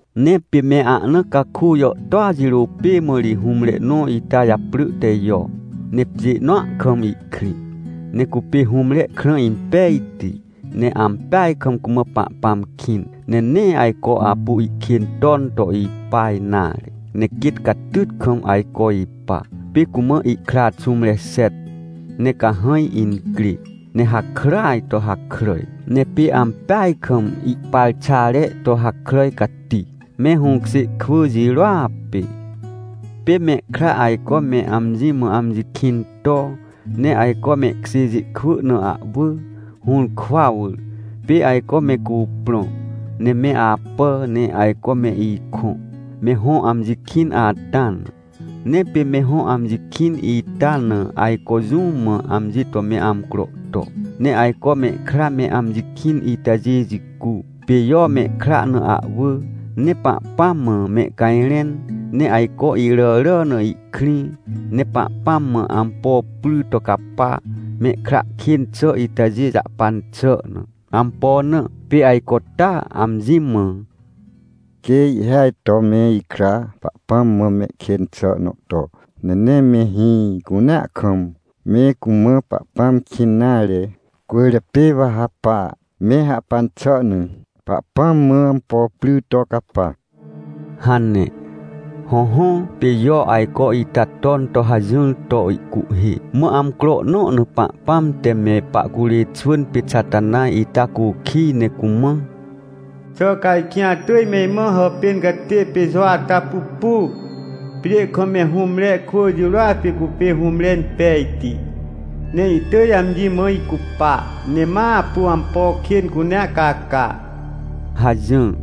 Ne pê me ahna caku jàhtôa jirô pê mã ri hũmre nõ ita japrỳ te Jo, ne pjê nõa kam ihkrĩ. Ne cupê hũmre krã impejti, ne ampeaj kam cumã Pahpãm kĩn, ne nee ajco apu ihkên ton to ipa nare, ne quêt catyt kam ajco ipa. Pê cumã ihkra xũmre xet, ne cahãj incrê, ne hakràaj to hakràj. Ne pê ampeaj kam ihparxare to hakràj cati, me hũkjê kwỳ jirôa pê. Pê mehkra ajco me amji mã amji kĩn to, ne ajco mehkjêjê kwỳ na ahwỳ, hũrkwa wỳr. Pê ajco me cuprõ, ne me apà, ne ajco me ikõ, me hõ amji kĩn ata na. Ne pê me hõ amji kĩn ita na ajco jũ mã amji to me amcro to. Ne ajco mehkra me amji kĩn itajê jicu, pê Jo mehkra na ahwỳ, ne Pahpãm mã mehcajrẽn. Ne ajco iràrà na ihkrĩ, ne Pahpãm mã ampo pry to capa, mehkra kên xà itajê jahpan xà na. Ampo na? Pê ajco taa amji mã: — Quê ihhêaj to me ikra Pahpãm mã mehkên xà nõ to, ne nee me hĩ cunea kam me cumã Pahpãm kĩn nare, cwỳrjapê wa ha pa, me hahpan xà na, Pahpãm mã ampo pry to capa — hane. Hõhõ, pê Jo ajco ita ton to hajỹr to ihcuhhê. Mã amcro nõ na Pahpãm te me pahcurê xwỳn pê Xatanaj ita cukij ne cumã: — Xà ca ajkĩ atỳj me imã hàpên catê pê Jo ata pupu? Pjê kam me hũmre kwỳ jirôa pê cupê hũmre impejti, ne ihtỳj amji mã icupa, ne ma apu ampo kên cunea caca — hajỹr.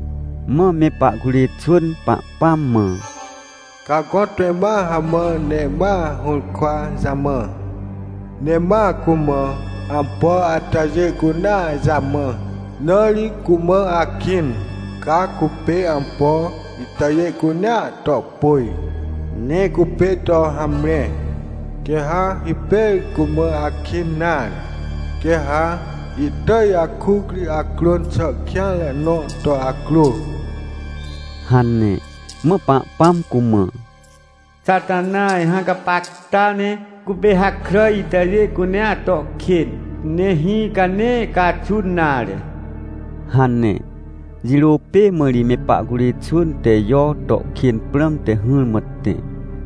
Mã me pahcurê xwỳn Pahpãm mã: — Ca gõtpê ma hamã, ne ma hũrkwa jamã, ne ma cumã ampo atajê cunea jamã, na ri cumã akĩn. Ca cupê ampo itajê cunea to pôj, ne cupê to hamre, quê ha hipêr cumã akĩn nare. Quê ha ihtỳj akuc ri acrôn xà kêanre nõ to acrô — hane. Mã Pahpãm cumã: — Xatanaj, hã gapacta ne cupê hakràj itajê cunea to kên, ne hĩ ca nee caxun nare — hane. Jirô pê mã ri me pahcurê xwỳn te Jo to kên prãmte hỹrmã tẽ.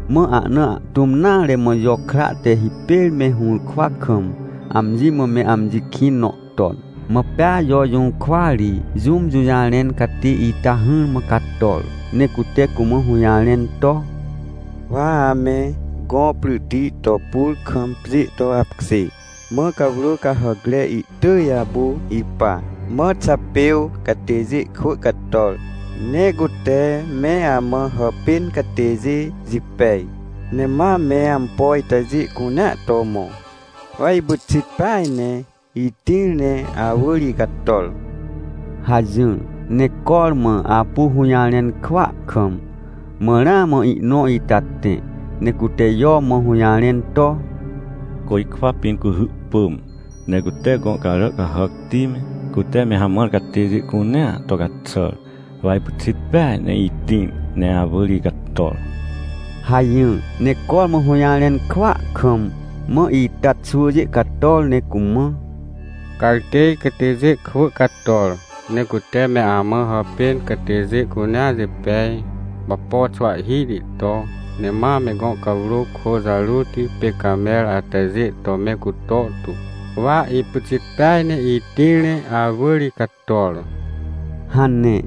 Mã ahna ahtũm nare mã Jo kra te hipêr me hũrkwa kam, amji mã me amji kĩn nõ ton. Mã pea Jo jũrkwa ri jũm jũjarẽn catê ita hỹrmã cator, ne cute cumã hũjarẽn to: — Wa ame gõ pryti to pur kam pjê to apkjê, mã cawrô cahàcre ihtỳj apu ipa. Mã Xapêw catêjê kwỳ cator, ne cute me amã hàpên catêjê jipej, ne ma me ampo itajê cunea to mõ. Wa ipyxit peaj ne itĩr ne awỳr icator — hajỹr. Ne cormã apu hũjarẽn kwỳa kam, mã ramã ihnõ ita tẽ, ne cute Jo mã hũjarẽn to: — Côjkwa pĩn cuhy pỳm, ne cute gõ carà cahàcti me, cute me hamãr catêjê cunea to caxàr. Wa ipyxit peaj ne itĩr ne awỳr icator — hajỹr. Ne cormã hũjarẽn kwỳa kam, mã ita xwỳjê cator ne cumã: — Cartêj catêjê kwỳ cator, ne cute me amã hàpên catêjê cunea jipej, wapo xwahhihti to, ne ma me gõ cawrô kô jarôti pê camer atajê to me cuto tu. Wa ipyxit peaj ne itĩr ne awỳr icator — hane.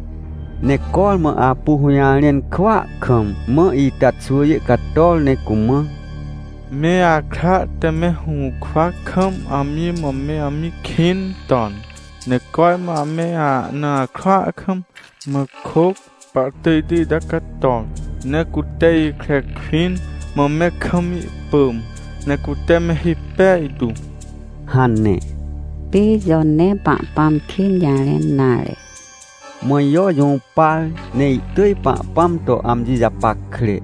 Ne cormã apu hũjarẽn kwỳa kam, mã ita xwỳjê cator, ne cumã: — Me akra te me hũrkwa kam amji mã me amji kĩn ton, ne cormã ame ahna akrua kam, mã kôc pahtỳjti ita cator, ne cute ikre kwĩn. Mã me kam ihpỳm, ne cute me hipej tu — hane. Pê Jo nee Pahpãm kên jarẽn nare Mã Jo jũpar par, ne ihtỳj Pahpãm to amji japackre,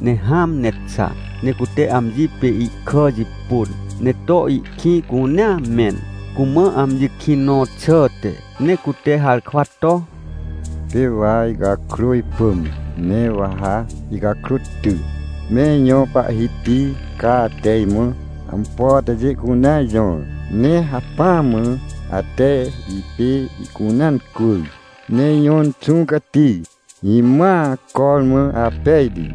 ne hãm ne xa. Ne cute amji pê ihkà jipôn, ne to ihkĩ cunea mẽn, cumã amji kĩn nõ xàhte. Ne cute harkwa to: — Pê wa icakrô ipỳm, ne wa ha icakrô ty. Me ijõ Pahhiti, ca ate imã ampo atajê cunea jõr, ne hacpỹa mã ate ipê ihcunea incwỳr. Ne ijõ Inxũ Cati, imãa, cormã apejti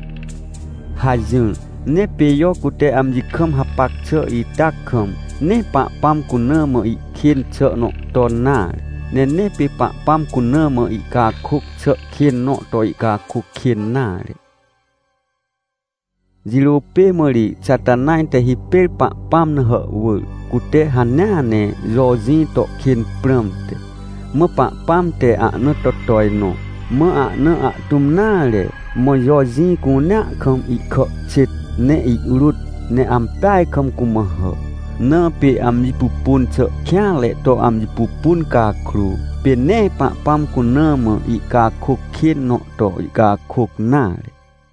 — hajỹr. Ne pê Jo cute amji kam hapac xà ita kam, nee Pahpãm cuna mã ihkên xà nõ ton nare, ne nee pê Pahpãm cuna mã ihcakôc xà kên nõ to ihcakôc kên nare. Jirô pê mã ri Xatanaj te hipêr Pahpãm na hàhwỳr, cute hanea ne Jo jĩ to kên prãmte. Mã Pahpãm te ahna to tojnõ. Mã ahna ahtũm nare, mã Jo jĩ cunea kam ihkà xêt, ne ihrôt ne ampeaj kam cumã hà. Na pê amji pupun xà kêanre to amji pupun cakrô, pê nee Pahpãm cuna mã ihcakôc kên nõ to ihcakôc nare.